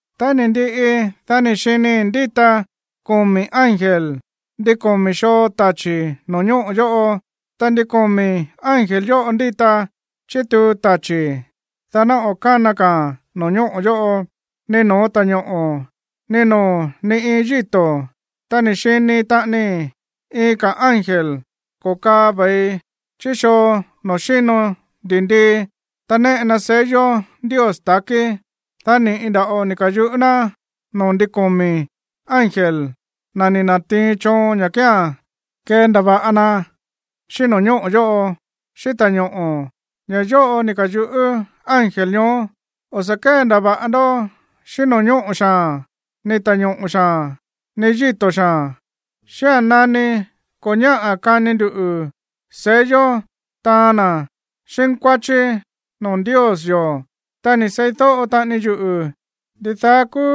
Tá ni̱ ndiꞌi, dá ni̱ xinii̱ ndíta komi̱ ángel ndin komi̱ xoo tachi̱ no̱ñóꞌo̱ yóꞌo. Ta ndin komi̱ ángel yóꞌo ndíta chítuu tachi̱, dá ná o̱ kána ka̱a̱n no̱ñóꞌo̱ yóꞌo, ni no̱ó ta̱ñoꞌo̱, ni noo̱ ni iin yíto̱. Ta ni̱ xini taꞌanii iin ka̱ ángel ko̱kaa ve̱i chí xoo noo̱ xíno ndi̱ndii, ta néꞌe na sello Ndios ta̱kí. Dá ni̱ꞌi nda̱ꞌo ni̱ ka̱yuꞌú ná noo̱ ndin komi̱ ángel, na̱ ni̱ na̱tiin choon ña̱ kía̱n kendava̱ꞌa na xíꞌín no̱ñóꞌo̱ yóꞌo, xíꞌín ta̱ñoꞌo̱. Ña̱ yóꞌo ni̱ ka̱yuꞌú ángel ñoó: ―O̱ sa̱ kéndava̱ꞌa ndó xíꞌín no̱ñóꞌo̱ xaa̱n, ni ta̱ñoꞌo̱ xaa̱n, ni yíto̱ xaa̱n xía̱n nani ko̱ ñáꞌa̱ kani ndu sello taan na̱ xínkuáchí noo̱ Ndios yo̱. Ta ni̱ seídóꞌo taꞌani yuꞌu̱ ndidaá kúú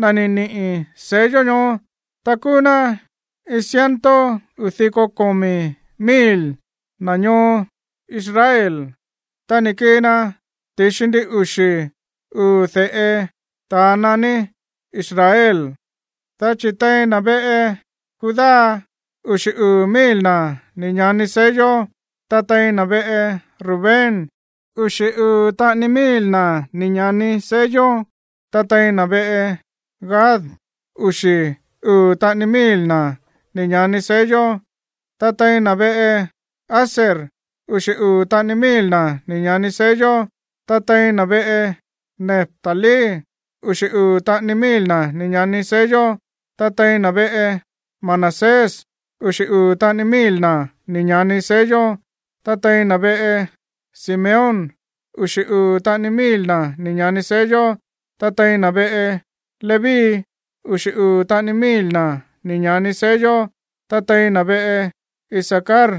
na̱ ni̱ niꞌi̱ sello ñoó. Ta kúú ná iin ciento uu̱ diko komi̱ mil na̱ ñoo Israel, ta ni̱ kii na ti̱xi ndin uxi̱ uu̱ de̱ꞌe ta̱a naní Israel. Dá chi̱ tein na̱ veꞌe Judá uxi̱ uu̱ mil na̱ ni̱ ña̱ni sello, ta tein na̱ veꞌe Rubén uxi̱ uu̱ taꞌani mil na̱ ni̱ ña̱ni sello, ta tein na̱ veꞌe Gad, uxi̱ uu̱ taꞌani mil na̱ ni̱ ña̱ni sello, ta tein na̱ veꞌe Aser uxi̱ uu̱ taꞌani mil na̱ ni̱ ña̱ni sello, ta tein na̱ veꞌe Neftalí uxi̱ uu̱ taꞌani mil na̱ ni̱ ña̱ni sello, ta tein na̱ veꞌe Manasés uxi̱ uu̱ taꞌani mil na̱ ni̱ ña̱ni sello, ta tein na̱ veꞌe Simeón uxi̱ uu̱ taꞌani mil na̱ ni̱ ña̱ni sello, ta tein na̱ veꞌe Leví uxi̱ uu̱ taꞌani mil na̱ ni̱ ña̱ni sello, ta tein na̱ veꞌe Isacar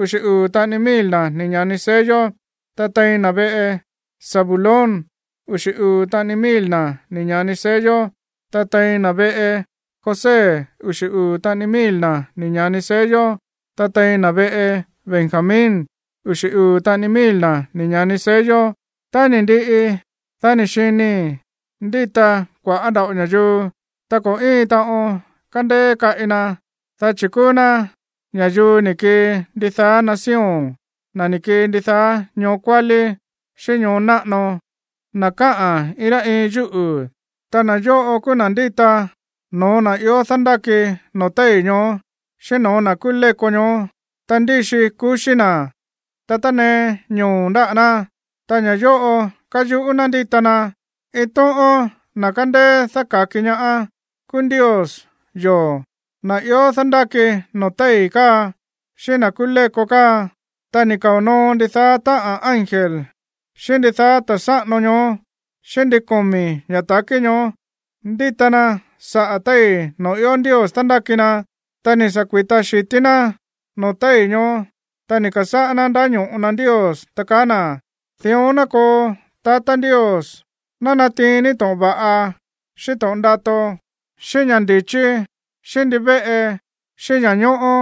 uxi̱ uu̱ taꞌani mil na̱ ni̱ ña̱ni sello, ta tein na̱ veꞌe Zabulón uxi̱ uu̱ taꞌani mil na̱ ni̱ ña̱ni sello, ta tein na̱ veꞌe José uxi̱ uu̱ taꞌani mil na̱ ni̱ ña̱ni sello, ta tein na̱ veꞌe Benjamín uxi̱ uu̱ taꞌani mil na̱ ni̱ ña̱ni sello. Tá ni̱ ndiꞌi, dá ni̱ xinii̱ ndíta kua̱ꞌá nda̱ꞌo ña̱yuu, ta ko̱ íin taꞌon kandeé kaꞌi na, dá chi̱ kúú ná ña̱yuu ni̱ kii ndidaá nación, na̱ ni̱ kii ndidaá ñoo kuálí, xíꞌín ñoo náꞌano, na̱ káꞌa̱n iin rá iin yúꞌu̱. Ta na̱ yóꞌo kúú na̱ ndíta no̱ó na̱ ió dándáki noo̱ téi̱ ñoó, xíꞌín no̱ó na̱ kúú léko ñoó. Ta ndíxi kuxí na̱, ta tánee ñoo̱ ndáꞌa̱ ná. Ta ña̱ yóꞌo káyuꞌú ná ndíta na: Iin tóꞌón na̱ kándéé dáka̱ki ñaá kúú Ndios yo̱, na̱ ió dándáki noo̱ téi̱ káa, xíꞌín na̱ kúú léko káa. Ta ni̱ kao̱ noo ndidaá táꞌa̱n ángel, xíꞌín ndidaá ta̱ sáꞌano ñoó, xíꞌín ndin komi̱ ña̱ ta̱kí ñoó ndíta na saꞌa̱ téi̱ noo̱ ió Ndios dándáki na. Ta ni̱ sa̱ kui̱ta xi̱tí ná noo̱ téi̱ ñoó, ta ni̱ ka̱sáꞌá ná ndáño̱ꞌo na Ndios, ta kaá na̱: Dión ná koo, tatá Ndios. Ná natiin ní to̱ꞌon va̱ꞌa, xíꞌín to̱ꞌon ndato, xíꞌín ña̱ ndi̱chí, xíꞌín ndivéꞌe, xíꞌín ña̱ñóꞌó,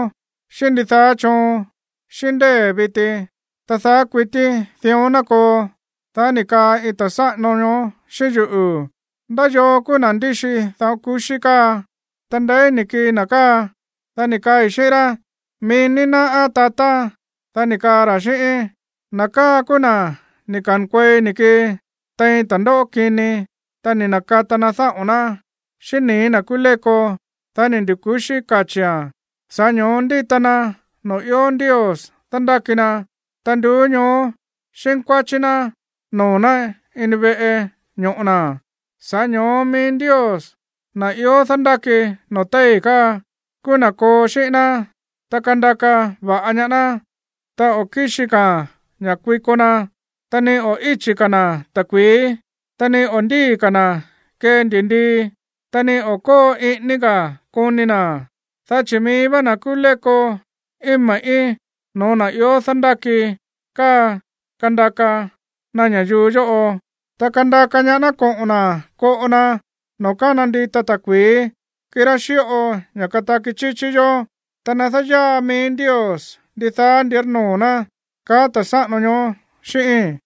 xíꞌín ndidaá choon, xíꞌín ndée̱ viti, ta daá kuití dión ná koo. Dá ni̱ kaa iin ta̱ sáꞌano ñoó xíꞌín yuꞌu̱: ―¿Ndá yoo kúú na̱ ndíxi dáꞌo̱n ku̱xí káa, ta ndeí ni̱ kii na̱ káa? Dá ni̱ kaai̱ xíꞌín rá: ―Mií ní náꞌá, tatá. Dá ni̱ kaa ra̱ xíꞌíín: ―Na̱ káa kúú na̱ ni̱ ka̱nkuei ni̱ kii tein ta̱ndóꞌó kini. Ta ni̱ na̱kata na dáꞌo̱n ná xíꞌín nii̱ na̱ kúú léko, dá ni̱ ndu̱ku̱xí kachi̱án. Sa̱ꞌá ño̱ó ndíta na noo̱ ió Ndios dándáki na, ta nduú ñoó xínkuáchí ná noo̱ ná ini veꞌe ño̱ꞌo na̱. Sa̱ꞌá ño̱ó mií Ndios, na̱ ió dándáki noo̱ téi̱ káa, kúú na̱ koo xíꞌín ná, ta kandaka va̱ꞌa ñaá ná. Ta o̱ kíxi ka̱ ña̱ kuiko na, ta ni o̱ íchi̱ ka̱ na̱ ta̱kui̱í, ta ni o̱ ndíi̱ ka̱ na̱ kee ndi̱ndii, ta ni o̱ kóo iꞌíní ka̱ koni na̱, dá chi̱ mií vá na̱ kúú léko íin me̱ꞌí no̱ó na̱ ió dándáki káa kandaka na ña̱yuu yóꞌo, ta kandaka ñaá ná koꞌo̱n na̱ koꞌo na noo̱ kána ndita ta̱kui̱í, kirá xíꞌo ña̱ kataki chíchí yó. Ta nadáyaa mií Ndios ndidaá ndírnoo̱ ná ―kaá ta̱ sáꞌano ñoó xíꞌíi̱n.